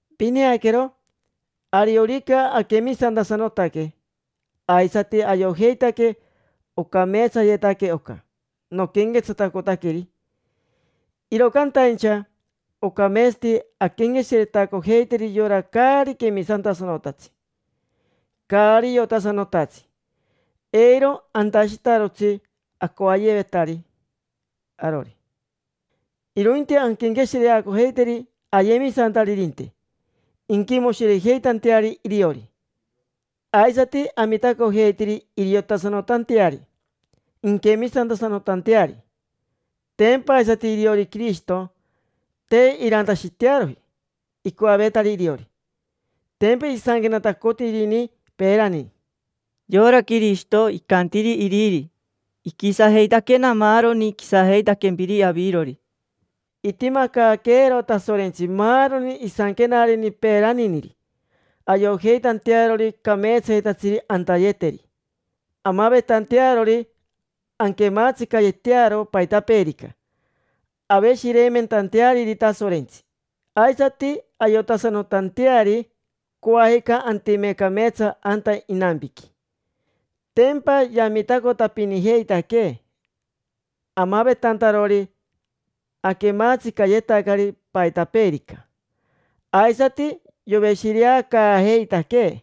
Pineaquero, ariorica aquemisantasanotaque aisati ayojeitaque ocameetsayetaque oca noquenquetsatacotaqueri, iro cantaincha ocameetsati anquenqueshiretacojeiteri yora caari quemisantasanotatsi, caari iotasanotatsi. Eiro antashitarotsi acoayevetari arori, irointi anquenqueshireacojeiteri ayemisantaririnte, inquimoshirejeitanteari iriori. Aisati amitacojeiteri iriotasanotanteari, inquemisantasanotanteari. Tempa aisati iriori Quirishito, te irantashitearoji icoavetari iriori. Tempa isanquenatacotirini peerani: “Yora Quirishito icantiri iriri: ‘Iquisajeitaquena maaroni quisajeitaquempiri avirori’”. Itimacaaqueero Tasorentsi maaroni isanquenareni peeraniniri ayojeitantearori cameetsayetatsiri antayeteri, amavetantearori anquematsicayetearo paitapeerica, aveshireimentanteariri Tasorentsi, aisati ayotasanotanteari coajica antime cameetsa anta inampiqui. Tempa yamitacotapinijeitaquee amavetantarori aquematsicayetacari paitapeerica, aisati yoveshireacaajeitaquee.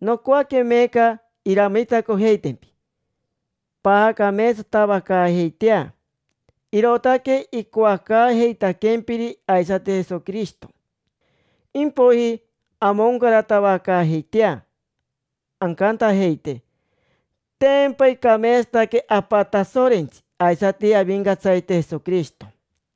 Nocoaque meeca iramitacojeitempi paacameetsatavacaajeitea. Irootaque icoacaajeitaquempiri aisati Jesoquirishito. Impoiji amoncaratavacaajeitea ancantajeite: “Tempa icameetsataque Apa Tasorentsi aisati Avincatsarite Jesoquirishito”.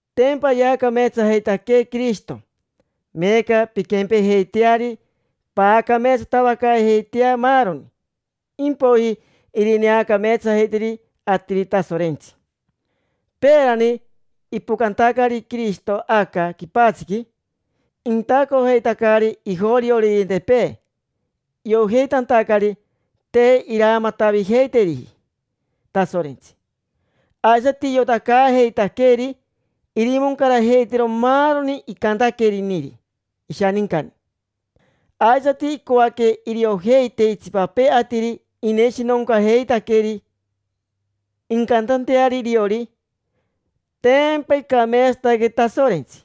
Tempa yaacameetsajeitaquee Quirishito. Meeca pinquempejeiteari, paacameetsatavacaajeitea maaroni, impoiji irineacameetsajeiteri atiri Tasorentsi. Peerani ipocantacari Quirishito aca quipatsiqui, intacojeitacari ijorioririntepee iojeitantacari te iramatavijeiteriji Tasorentsi. Aisati iotacaajeitaqueri irimoncarajeitero maaroni icantaqueriniri ishanincani. Aisati icoaque iriojeite itsipapee atiri ineshinoncaajeitaqueri, incantanteari iriori: “Tempa icameetsataque Tasorentsi”.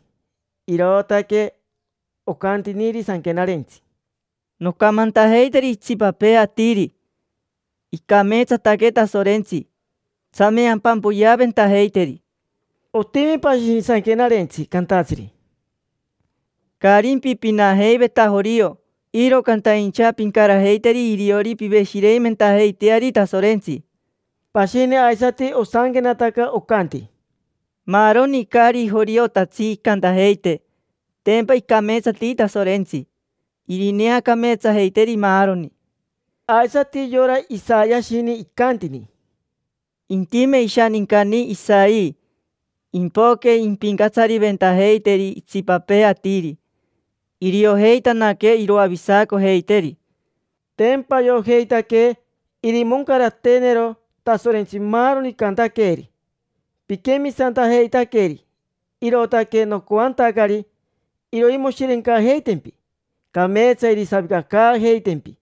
Irootaque ocantiniri Sanquenarentsi: “Noncamantajeiteri itsipapee atiri: ‘Icameetsataque Tasorentsi, tsame ampampoyeaventajeiteri’”. Otimi pashini Sanquenarentsi cantatsiri: “Caarimpi pinajeiveta jorio, iro cantaincha pincarajeiteri iriori piveshireimentajeiteari Tasorentsi”. Pashini aisati osanquenataca, ocanti: “Maaroni caari joriotatsi incantajeite: ‘Tempa icameetsati Tasorentsi’. Irineacameetsajeiteri maaroni”. Aisati yora Isayashini icantini: “Intime ishanincani Jese, impoque impincatsariventajeiteri itsipapee atiri, iriojeitanaque iroavisacojeiteri”. Tempa ayojeitaque irimoncarateenero Tasorentsi maaroni icantaqueeri. Piquemisantajeitaqueri, irootaque nocoantacari iroimoshirencajeitempi, cameetsa irisavicacaajeitempi.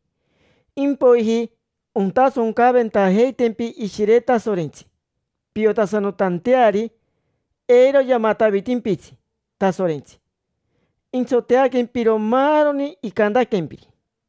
Impoiji ontasoncaventajeitempi Ishire Tasorentsi piotasanotanteari eiro yamatavitimpitsi Tasorentsi, intsoteaquempiro maaroni icantaquempiri.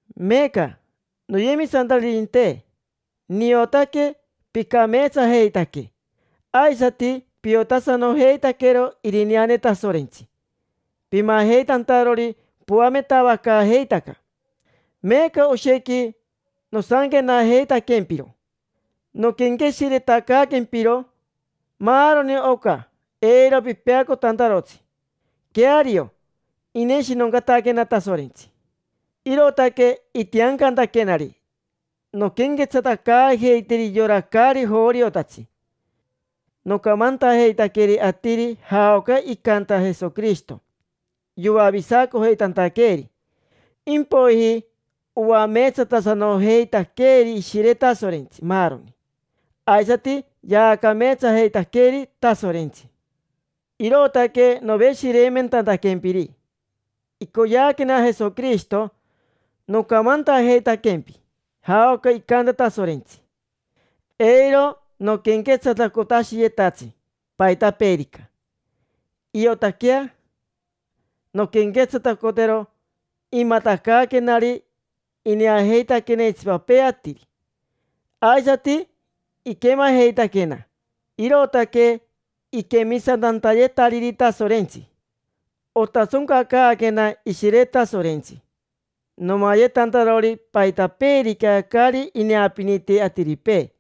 Meeca, noyemisantaririnte, niotaque picameetsajeitaque, aisati piotasanojeitaquero irineane Tasorentsi pimajeitantarori poametavacaajeitaca. Meeca oshequi nosanquenajeitaquempiro, noquenqueshiretacaaquempiro maaroni oca eiro pipeacotantarotsi. Queario, ineshinoncataquena Tasorentsi, irootaque itiancantaquenari nonquenquetsatacaajeiteri yora caari joriotatsi. Nocamantajeitaqueri atiri jaoca icanta Jesoquirishito yoavisacojeitantaqueeri. Impoiji oameetsatasanojeitaqueri Ishire Tasorentsi maaroni, aisati yaacameetsajeitaqueri Tasorentsi. Irootaque noveshireimentantaquempiri: icoyeaquena Jesoquirishito nocamantajeitaquempi jaoca icanta Tasorentsi. Eiro noquenquetsatacotashiyetatsi paitapeerica, iotaquea nonquenquetsatacotero imatacaaquenari. Ineajeitaquena itsipapee atiri, aisati iquemajeitaquena, irootaque iquemisantantayetariri Tasorentsi. Otasoncacaaquena Ishire Tasorentsi, nomayetantarori paitapeerica caari ineapiniti atiripee.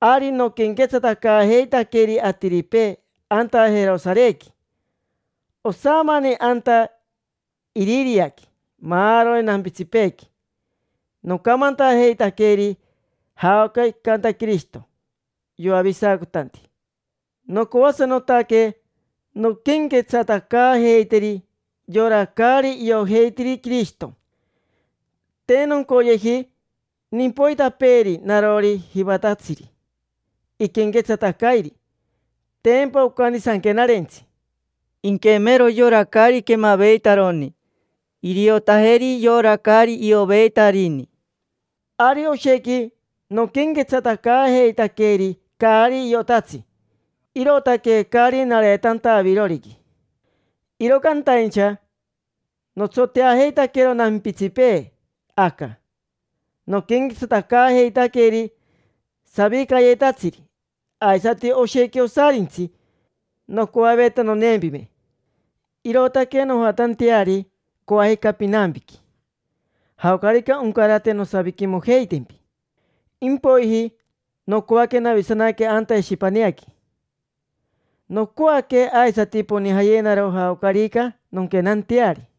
Ari noquenquetsatacaajeitaqueri atiripee anta Jerosarequi, osamani anta Iririaqui, maaroni nampitsipeequi. Nocamantajeitaqueri jaoca icanta Quirishito yoavisacotanti. Nocoasanotaque nonquenquetsatacaajeiteri yora caari iojeitiri Quirishito. Te noncoyeji nimpoitapeeri narori jivatatsiri iquenquetsatacairi. Tempa ocanti Sanquenarentsi: “Inquemero yora caari quemaveitaroni; iriotajeri yora caari ioveitarini”. Ari oshequi noquenquetsatacaajeitaqueri caari iotatsi, irootaque caari nareetanta aviroriqui. Iro cantaincha notsoteajeitaquero nampitsipee aca, noquenquetsatacaajeitaqueri savicayetatsiri, aisati oshequi osarintsi nocoaveta noneempime, irootaque nojatanteari coajica pinampiqui. Jaocarica oncarate nosaviquimojeitempi, impoiji nocoaque navisanaque anta Eshipaneaqui. Nocoaque aisati ponijayenaro jaocarica nonquenanteari.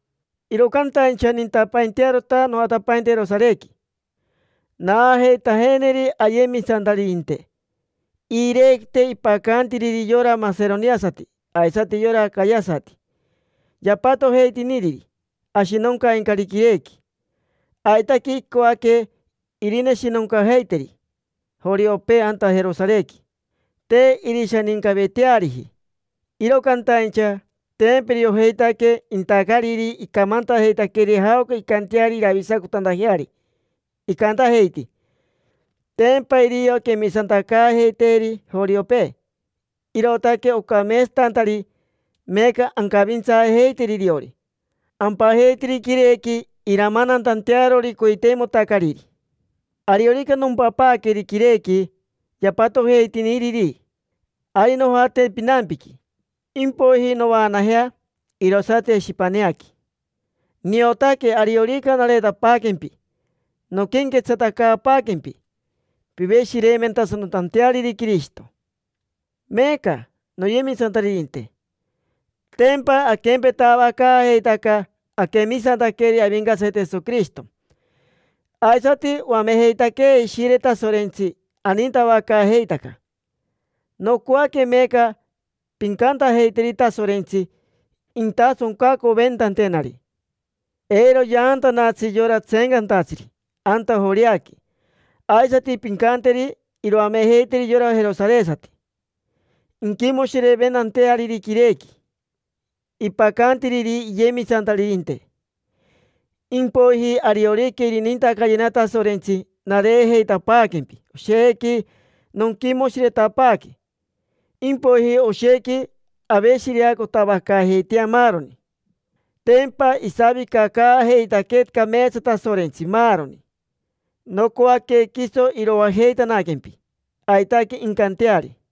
Iro cantaincha nintapaintearota nojatapainte Jerosarequi, naajeitajeneri ayemisantaririnte iirequite ipacantiriri yora maseroniasati aisati yora acayasati. Yapatojeitiniriri ashinoncaincari quirequi. Aitaque icoaque irineshinoncajeiteri joriopee anta Jerosarequi. Te irishanincaveteariji, iro cantaincha tempa iriojeitaque intacariri icamantajeitaqueri jaoca incanteari iravisacotantajeari. Icantajeiti: “Tempa irio quemisantacaajeiteeri joriopee, irootaque ocameetsatantari meeca ancavintsaajeiteri iriori. Ampajeiteri quirequi iramanantantearori coiteimotacariri”. Ariorica nompapaaqueri quirequi yapatojeitiniriri, ari nojate pinampiqui. Impoiji novaanajea, irosati Eshipaneaqui. Niotaque ariorica nareetapaaquempi nonquenquetsatacaapaaquempi piveshireimentasanotanteariri Quirishito. Meeca, noyemisantaririnte, tempa aquempetavacaajeitaca aquemisantaqueri Avincatsarite Jesoquirishito, aisati oamejeitaquee Ishire Tasorentsi anintavacaajeitaca. Nocoaque meeca pincantajeiteri Tasorentsi intasoncacoventantenari, eiro yaantanatsi yora tseencantatsiri anta Joreaqui. Aisati pincanteri iroamejeiteri yora jerosaresati inquimoshireimentanteariri quirequi ipacantiriri iyemisantaririnte. Impoiji ariorica irinintacayena Tasorentsi, nareejeitapaaquempi, oshequi nonquimoshiretapaaque. Impoiji oshequi aveshireacotavacaajeitea maaroni. Tempa isavicacaajeitaquee cameetsa Tasorentsi, maaroni. Nocoaque quiso iroajeitanaquempi. Aitaque incanteari.